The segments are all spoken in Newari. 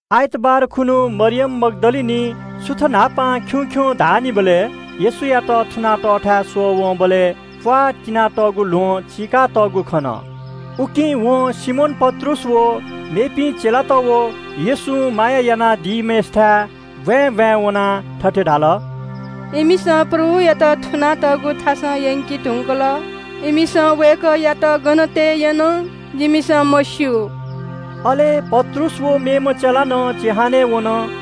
आइतबार खुन्‍हु मरियम मग्‍दलिनी सुथ न्‍हापां खिउँ खिउँ धाःनिबलय् येशूयात तया तःथाय् स्‍वःवंबलय् प्‍वाः तिनातःगु ल्‍वहं चीकातःगु खन। उकिं वं सिमोन पत्रुस व मेपिं चेलात व येशूं माया यानादीम्‍हय्‌सिथाय् ब्‍वाँय् ब्‍वाँय् वनाः थथे धाल – “इमिसं प्रभुयात तयातःगु थासं यंके धुंकल। इमिसं वय्‌कःयात गन तये यन, जिमिसं मस्‍यू।” अले पत्रुस व मेम्‍ह चेला नं चिहानय् वन।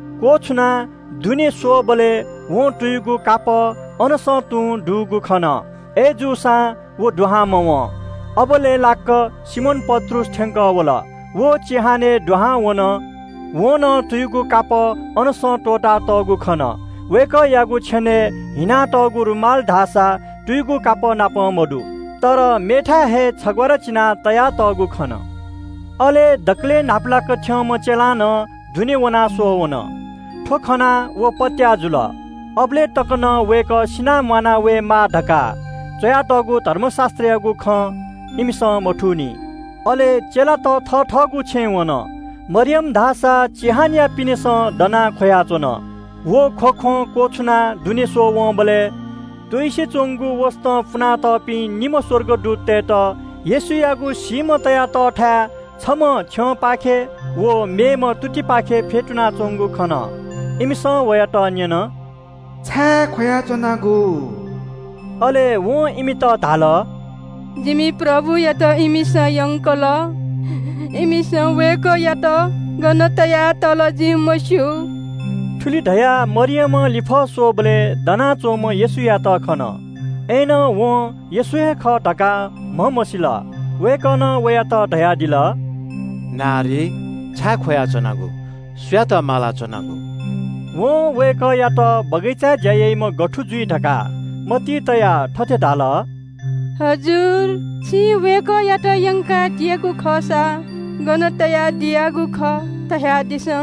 क्‍वछुनाः दुने स्‍वःबलय् वं सूती कापः अनसं तुं दुगु खन। अय्‌जूसां व दुहां मवं। अबलय् लाक्‍क सिमोन पत्रुस थ्‍यंकः वल। व चिहानय् दुहां वन। वं नं सूती कापः अनसं त्‍वःतातःगु खन। वय्‌कःयागु छेनय् हिनातःगु रुमाल धाःसा सूती कापः नाप मदु, तर मेथाय् हे छग्‍वारा चिनाः तयातःगु खन। अले दकलय् न्‍हापालाक थ्‍यंम्‍ह चेला नं दुने वनाः स्‍वःवन। थ्‍व खनाः व पत्‍याः जुल। अबलय् तक नं वय्‌कः सिनाः म्‍वाना वयेमाः धकाः च्‍वयातःगु धर्मशास्‍त्रयागु खँ इमिसं मथूनि। अले चेलात थथःगु छेँय् लिहां वन। मरियम धाःसा चिहानया पिनेसं दनाः ख्‍वयाच्‍वन। वं ख्‍वख्‍वं क्‍वछुनाः दुने स्‍वःबलय् त्‍वइसे च्‍वंगु वसतं पुनातःपिं निम्‍ह स्‍वर्गदूततय्‌त येशूयागु सीम्‍ह तया तःथाय् छम्‍ह छ्यंपाखे व मेम्‍ह तुतिपाखे फ्‍यतुनाच्‍वंगु खन। इमिसं वयात न्‍यन – “छाय् ख्‍वयाच्‍वनागु?” अले वं इमित धाल – “जिमि प्रभुयात इमिसं यंकल। इमिसं वय्‌कःयात गन तया तल जिं मस्‍यू।” थुलि धयाः मरियमं लिफः स्‍वःबलय् दनाच्‍वंम्‍ह येशूयात खन। अय्‌नं वं येशू हे खः धकाः म्‍हमसील। वय्‌कलं वयात धयादिल – “अय् मय्‌जु, छ छाय् ख्‍वयागु? सुयात मालागु?” वं वय्‌कःयात बगैँचाय् ज्‍या याइम्‍ह मनू जुइ धकाः मतिइ तयाः थथे धाल – “भाजु, छिं वय्‌कःयात यंकादियागु खःसा गन तयादिया जितः धयादिसँ।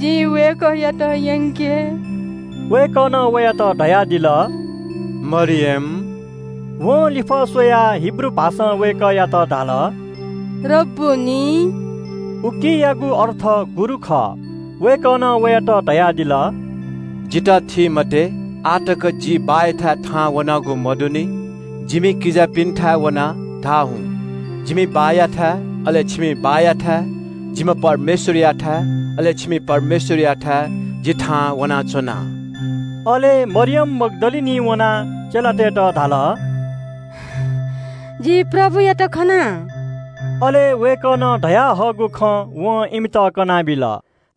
जिं वय्‌कःयात यंके।” वय्‌कलं वयात धयादिल – “मरियम!” वं लिफः स्‍वयाः हिब्रू भाषां वय्‌कःयात धाल – “रब्‍बोनी।” उकियागु अर्थ “गुरु” खः। वय्‌कलं वयात धयादिल – “जितः थी मते, आः तक जि बाःयाथाय् थाहां वनागु मदुनि। जिमि किजापिन्‍थाय् वनाः धाः हुँ – ‘जिमि बाःयाथाय् अले छिमि बाःयाथाय्, जिम्‍ह परमेश्‍वरयाथाय् अले छिमि परमेश्‍वरयाथाय् जि थाहां वनाच्‍वना।’” अले मरियम मग्‍दलिनीं वनाः चेलातय्‌त धाल – “जिं प्रभुयात खना।” अले वय्‌कलं धयाहःगु खँ वं इमित कनाबिल।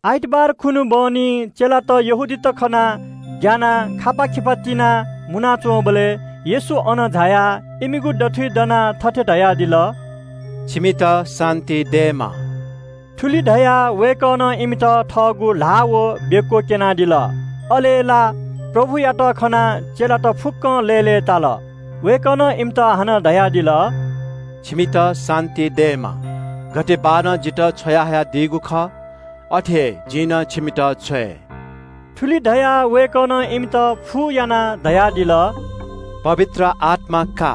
आइतबार खुन्‍हु बहनी चेलात यहूदीतय् नायःत खनाः ग्‍यानाः खापात तिनाः मुनाच्‍वंबलय् येशू अन झायाः इमिगु दथुइ दनाः थथे धयादिल – “छिमित शान्‍ति दयेमा।” थुलि धयाः वय्‌कलं इमित थःगु ल्‍हाः व बेक्‍व क्‍यनादिल। अले ला प्रभुयात खनाः चेलात फुक्‍कं लय्‌लय्‌ताल। वय्‌कलं इमित हानं धयादिल – “छिमित शान्‍ति दयेमा। गथे बाःनं जितः छ्वयाहयादीगु खः अथे हे जिं नं छिमित छ्वये।” थुलि धयाः वय्‌कलं इमित फू यानाः धयादिल – “पवित्र आत्‍मा का।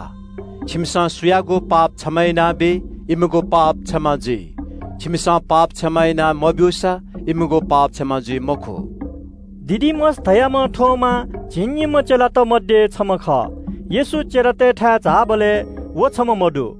छिमिसं सुयागु पाप क्षमा यानाबी इमिगु पाप क्षमा जुइ। छिमिसं पाप क्षमा याना मब्‍यूसा इमिगु पाप क्षमा जुइ मखु।” दिदुमस धाःम्‍ह थोमा झिंनिम्‍ह चेलात मध्‍ये छम्‍ह खः। येशू चेलातय्‌थाय् झायादीबलय् व छम्‍ह मदु।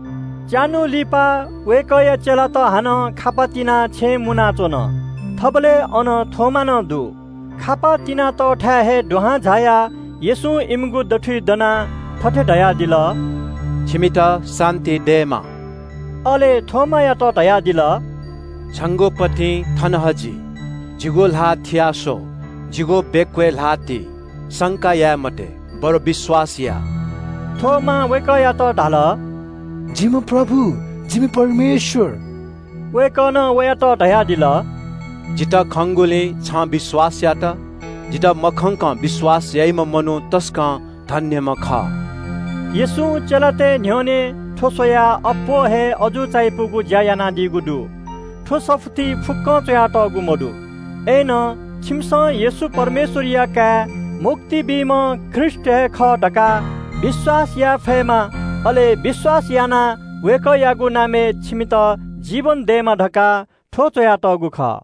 च्‍यान्‍हु लिपा, वय्‌कःया चेलात हानं खापा तिनाः छेँय् मुनाच्‍वन। थुबलय् अन थोमा नं दु। खापा तिनातःथाय् हे दुहां झायाः येशूं इमिगु दथुइ दनाः थथे धयादिल – “छिमित शान्‍ति दयेमा।” अले थोमायात धयादिल – “छंगु पतिं थन हजि, जिगु ल्‍हाः थिया स्‍वः। जिगु बेक्‍वय् ल्‍हाः ति। संका याये मते, बरु विश्‍वास या।” अले थोमां वय्‌कःयात धाल – “जिम्‍ह प्रभु, जिम्‍ह परमेश्‍वर।” वय्‌कलं वयात धयादिल – “जितः खंगुलिं छं विश्‍वास यात। जितः मखंकं विश्‍वास याइम्‍ह मनू तसकं धन्‍यम्‍ह खः।” येशूं चेलातय् न्‍ह्यःने थ्‍व स्‍वयाः अप्‍वः हे अजू चायापुगु ज्‍या यानादीगु दु। थ्‍व सफुलिइ फुक्‍कं च्‍वयातःगु मदु। अय्‌नं छिमिसं येशू परमेश्‍वरया काय्, मुक्ति बीम्‍ह ख्रीष्‍ट हे खः धकाः विश्‍वास याये फयेमा, अले विश्‍वास यानाः वय्‌कःयागु नामय् छिमित जीवन दयेमा धकाः थ्‍व च्‍वयातःगु खः।